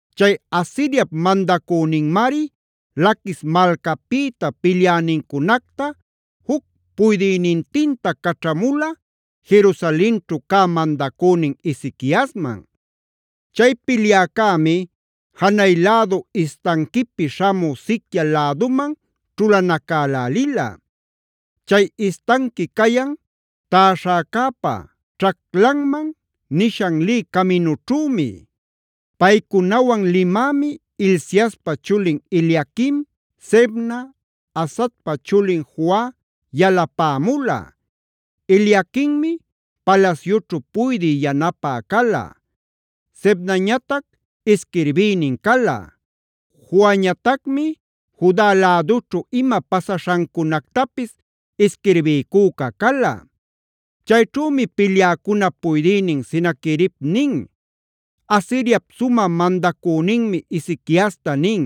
Chay Asiriap mandacüninmari Laquis malcapïta pilyänincunacta juc puydïnintinta caćhamula, Jerusalenćhu cä mandacünin Ezequiasman. Chay pilyäcämi janay lädu istanquipi śhamü siquia läduman ćhulanacälälila; chay istanqui cayan Täśhäcäpa Ćhaclanman nishan lï caminućhümi. Paycunawan limämi Hilciaspa chulin Eliaquim, Sebna, Asafpa chulin Joa yalapämula. Eliaquimmi palasyućhu puydï yanapä cala; Sebnañatac isquirbïnin cala; Joañatacmi Juda lädućhu ima pasaśhancunactapis isquirbiycüca cala. Chayćhumi pilyäcunap puydïnin Senaquerib nin: “Asiriap sumä mandacüninmi Ezequiasta nin: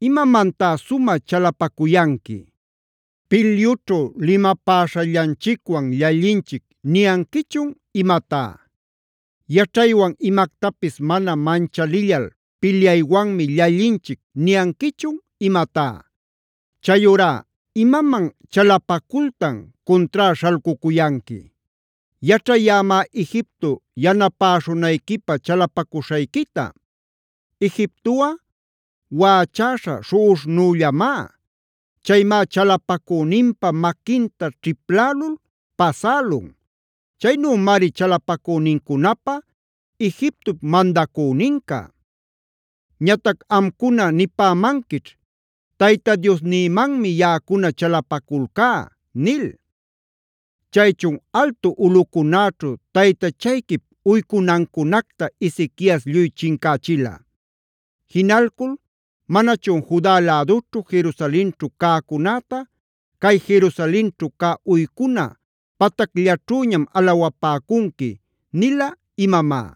‘¿Imamantá sumä chalapacuyanqui? ¿Pilyućhu limapäśhallanchicwan llallinchic niyanquichun imatá? ¿Yaćhaywan imactapis mana manchalillal pilyaywanmi llallinchic niyanquichun imatá? Chayurá ¿imaman chalapacultan cuntrá śhalcucuyanqui? Yaćhayämá Egipto yanapäśhunayquipä chalapacuśhayquita. Egiptoꞌa waꞌachäśha śhuꞌuśhnullämá;a chaymá chalapacüninpa maquinta ćhiplälul pasälun. Chaynümari chalapacünincunapä Egiptop mandacüninca. Ñatac amcuna nipämanquićh: “Tayta Diosnïmanmi yaꞌacuna chalapaculcá” nil. Chaychun ¿altu ulꞌucunäćhu taytachayquip uycunancunacta Ezequias lluy chincächila? ¿Jinalcul manachun “Juda lädućhu, Jerusalenćhu cäcunäta cay Jerusalenćhu cä uycuna patacllaćhüñam alawapäcunqui” nila imamá?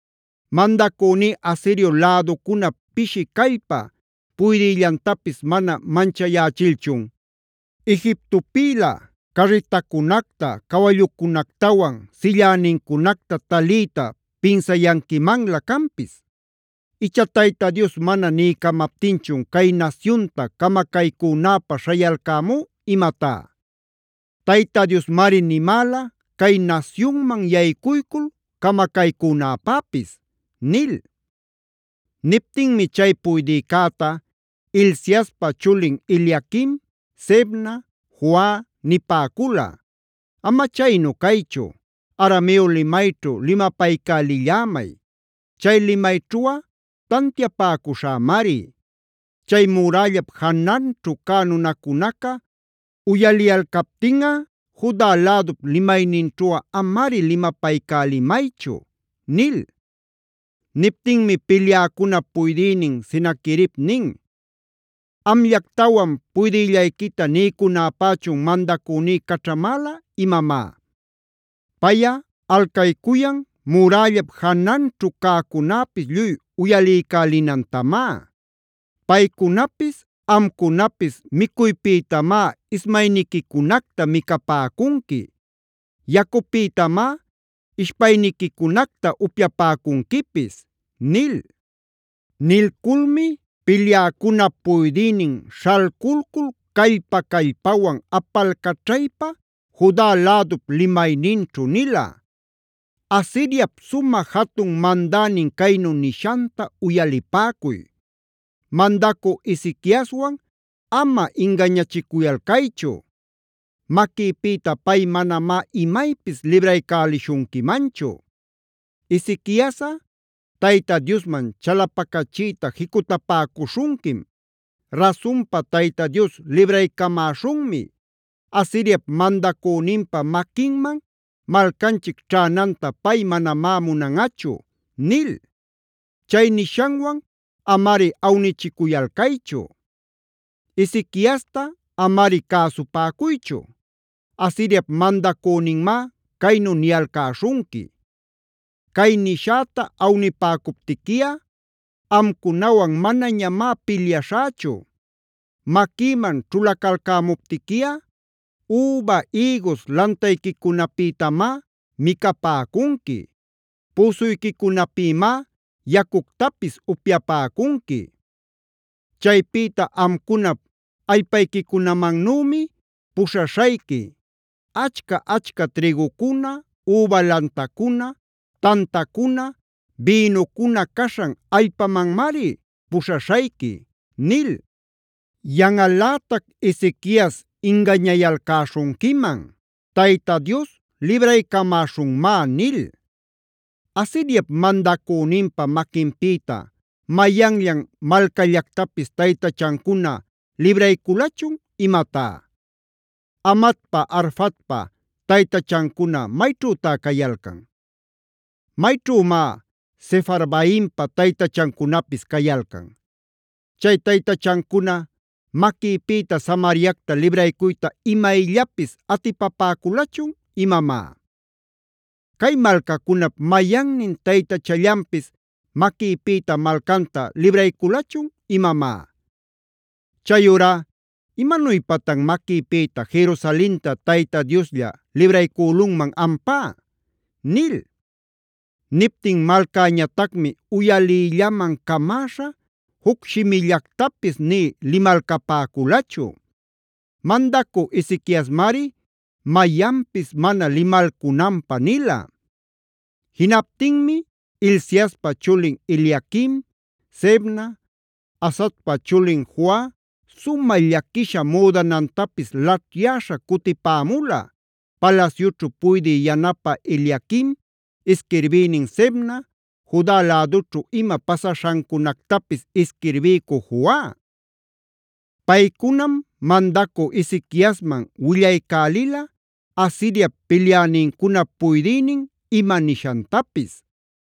Mandacüní Asirio läducunap pishi callpa puydïllantapis mana manchayächilchun, ¿Egiptopïlä carritacunacta, cawallucunactawan sillänincunacta taliyta pinsayanquimanlä canpis? Icha ¿Tayta Dios mana niycamaptinchun cay nasyunta camacaycunäpä śhayalcämú imatá? Tayta Diosmari nimäla cay nasyunman yaycuycul camacaycünäpäpis’” nil. Niptinmi chay puydïcäta Hilciaspa chulin Eliaquim, Sebna, Joa nipäcula: “Ama chaynu caychu, Arameo limayćhu limapaycälillämay; chay limayćhuꞌa tantiapäcuśhämari. Chay murällap jananćhu cä nunacunaca uyaliyalcaptinꞌa, Juda lädup limayninćhuꞌa amari limapaycälimaychu” nil. Niptinmi pilyäcunap puydïnin Senaquerib nin: “¿Amllactawan puydïllayquita niycunäpächun mandacüní caćhamäla imamá? Payꞌa alcaycuyan murällap jananćhu cäcunäpis lluy uyaliycälinantamá. Paycunapis amcunapis micuypïtamá ismayniquicunactab micapäcunqui; yacupïtamá ishpayniquicunacta upyapäcunquipis” nil. Nilculmi pilyäcunap puydïnin śhalculcul callpa-callpawan apalcaćhaypa Juda lädup limayninćhu nila: “Asiriap sumä jatun mandänin caynu nishanta uyalipäcuy: Mandacü Ezequiaswan ama ingañachicuyalcaychu; maquïpïta pay manamá imaypis libraycälishunquimanchu. Ezequiasꞌa Tayta Diosman chalapacachiyta jicutapäcuśhunquim: ‘Rasunpa Tayta Dios libraycamäśhunmi. Asiriap mandacüninpa maquinman malcanchic ćhänanta pay manamá munanꞌachu’ nil. Chay nishanwan amari awnichicuyalcaychu. “Ezequiasta amari cäsupäcuychu. Asiriap mandacüninmá caynu niyalcäśhunqui: ‘Cay nishäta awnipäcuptiquiꞌa amcunawan manañamá pilyaśhächu. Maquïman ćhulacalcämuptiquiꞌa üba, ïgus lantayquicunapïtamá micapäcunqui; püsuyquicunapïmá yacuctapis upyapäcunqui. Chaypïta amcunap allpayquicunamannümi puśhaśhayqui; achca-achca trïgucuna, üba lantacuna, tantacuna, bïnucuna caśhan allpamanmari puśhaśhayqui’ nil. “Yanꞌalätac Ezequias ingañayalcäśhunquiman ‘Tayta Dios libraycamäśhunmá’ nil. ¿Asiriap mandacüninpa maquinpïta mayanllan malcallactapis taytachancuna librayculachun imatá? ¿Hamatpa Arfadpa taytachancuna mayćhütá cayalcan? ¿Mayćhümá Sefarvaimpa taytachancunapis cayalcan? ¿Chay taytachancuna maquïpïta Samariacta libraycuyta imayllapis atipapäculachun imamá? ¿Cay malcacunap mayannin taytachallanpis maquïpïta malcanta librayculachun imamá? Chayurá ¿imanuypatan maquïpïta Jerusalenta Tayta Dioslla libraycülunman ampá?” nil. Niptin malcäñatacmi uyaliyllaman camäśha juc shimillactapis nï limalcapäculachu. Mandacü Ezequiasmari mayanpis mana limalcunanpä nila. Jinaptinmi Hilciaspa chulin Eliaquim, Sebna, Asafpa chulin Joa sumä llaquisha müdanantapis laćhyäśha cutipämula: palasyućhu puydï yanapä Eliaquim, isquirbïnin Sebna, Juda lädućhu ima pasaśhancunactapis isquirbiycü Joa. Paycunam mandacü Ezequiasman willaycälila Asiriap pilyänincunap puydïnin ima nishantapis.